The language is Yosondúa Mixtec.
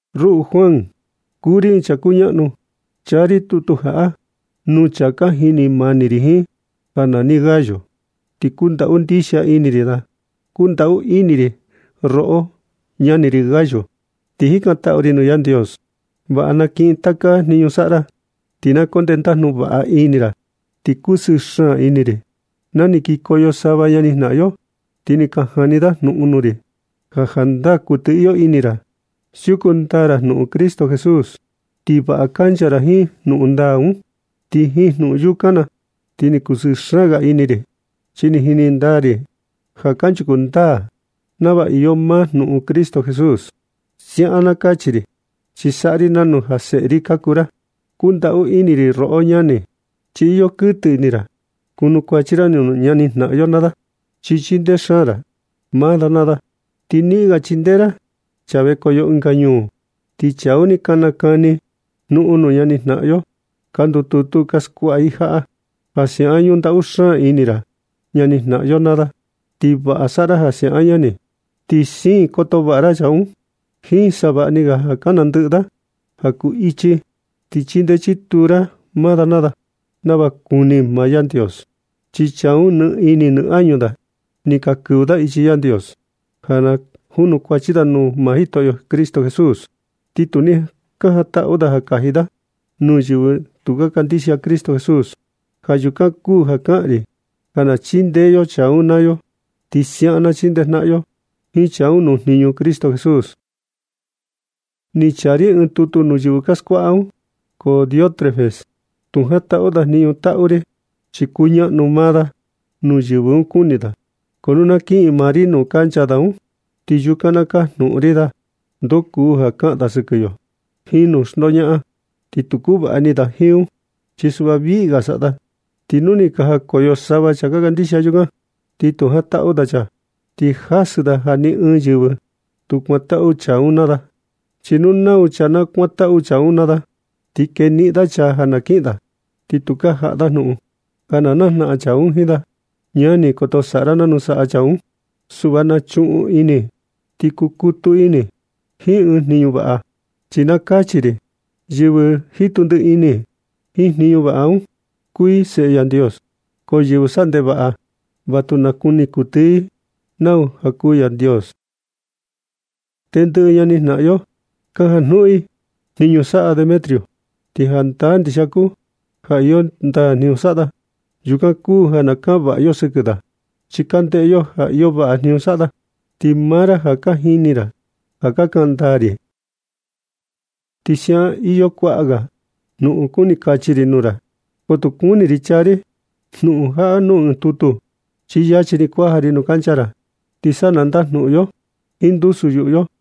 Ruꞌu Juan, kuu ri ɨɨn chaa kuñaꞌnu, chaa ri tutu jaꞌa nuu chaa ka jini mani ri jiin ja nani Gayo, ti kundaꞌu ndixia ini ri da. Kundaꞌu ini ri roꞌo ñani Gayo, ti jikantaꞌu ri nuu Yandios ja vaꞌa na kiꞌin taka jniñu saꞌa ra, ti na koo ndendajnu vaꞌa ini ra. Ni kusɨɨ xaan ini ri na ni kikoyo sava ñani jnaꞌan yo naa da, ti ni ka jani da jnuꞌun nuu ri, ja ndaa iyo kuɨtɨ ini ra siuku ndaa ra jnuꞌun Cristo Jesús, ti vaꞌa kancha ra jiin jnuꞌun ndaa un. Ti jiin jnuꞌun yukan na ti ni kusɨɨ xaan ga ini ri, chi ni jini ndaa ri ja kanchuku ndaa nava iyo maa jnuꞌun Cristo Jesús. Siaꞌan na kachi ri, chi saꞌa ri nanu ja seꞌe ri ka kuu ra. Kundaꞌu ini ri roꞌo ñani, chi iyo kuɨtɨ ini ra kunukuachi ra nuu ñani jnaꞌan yo naa da, chi chindee xaan ra maa da naa da, ti niꞌin ga chindee ra chaa vekoyo ɨnga ñuu. Ti chaa un ni ka nakani jnuꞌun nuu ñani jnaꞌan yo ka ndututu ka skuaꞌa i jaꞌa, ja siaꞌan ñundaꞌu xaan ini ra ñani jnaꞌan yo naa da. Ti vaꞌa saꞌa ra ja siaꞌan ñani. Ti siin koto vaꞌa ra chaa un jiin savaꞌni ga ja ka nandɨꞌɨ da ja kuu ichi, ti chindee chituu ra maa da naa da nava kuni maa Yandios. Chi chaa un, nɨ ini nɨ añu da ni ka kɨvɨ da ichi Yandios ja na junukuachi da nuu Jitoꞌo Cristo Jesús, ti tu ni ka jantaꞌu da ja kaji da nuu yɨvɨ tu ka kandixia Cristo Jesús. Ja yukan kuu ja kaꞌan ri, ja na chindee yo chaa un naa yo. Ti siaꞌan na chindejnaꞌan yo jiin chaa un nuu jniñu Cristo Jesús. Ni chaa ri ɨɨn tutu nuu yɨvɨ ka skuaꞌa un, ko Diótrefes tu jantaꞌu da jniñu taꞌu ri, chi kuñaꞌnu maa da nuu yɨvɨ un kuni da. Ko nu na kiꞌin maa ri nuu kancha da un, ti yukan na kajnuꞌun ri da ndoo kuu ja kaꞌan da sɨkɨ yo jiin jnuꞌun xndoñaꞌan. Ti tu kuvaꞌa ini da jiin un, chi suꞌva viꞌga saꞌa da. Nu ni ka jakoyo sava chaa ka kandixia yukan, ti tu jantaꞌu da chaa, ti jasɨ da ja ni ɨɨn yɨvɨ tu kuantaꞌu chaa un naa da, chi nu nau chaa na kuantaꞌu chaa un naa da, ti keniꞌin da chaa ja na kiꞌin da, ti tukaa jaꞌa da jnuꞌun ja najnaꞌan chaa un jiin da. Ñani, koto saꞌa ra nanu saꞌa chaa un. Suꞌva na chuꞌun ini ti kukutu ini jiin ɨɨn jniñu vaꞌa, chi na kachi ri: Yɨvɨ jitu ndiꞌi ini jiin jniñu vaꞌa un, kuu i seꞌe Yandios, ko yɨvɨ saꞌa ndevaꞌa va tu nakuni kuɨtɨ i nau kuu Yandios. Tendɨꞌɨ ñani jnaꞌan yo ka janjnuꞌun i jniñu saꞌa Demetrio, chi jandaa ndixia kuu ja iyo ndaa jniñu saꞌa da. Yukan kuu ja na kaꞌan vaꞌa yo sɨkɨ da, chi ka ndeꞌe yo ja iyo vaꞌa jniñu saꞌa da, ti maa ra ja ka jini ra ja ka kaꞌan ndaa ri. Ti siaꞌan iyo kuaꞌa ga jnuꞌun kuni kachi ri nuu ra, ko tu kuni ri chaa ri jnuꞌun jaꞌa nuu ɨɨn tutu, chi yachi ni kuaja ri nuu kancha ra, ti sa na ndajnuꞌun yo jiin ndusu yuꞌu yo.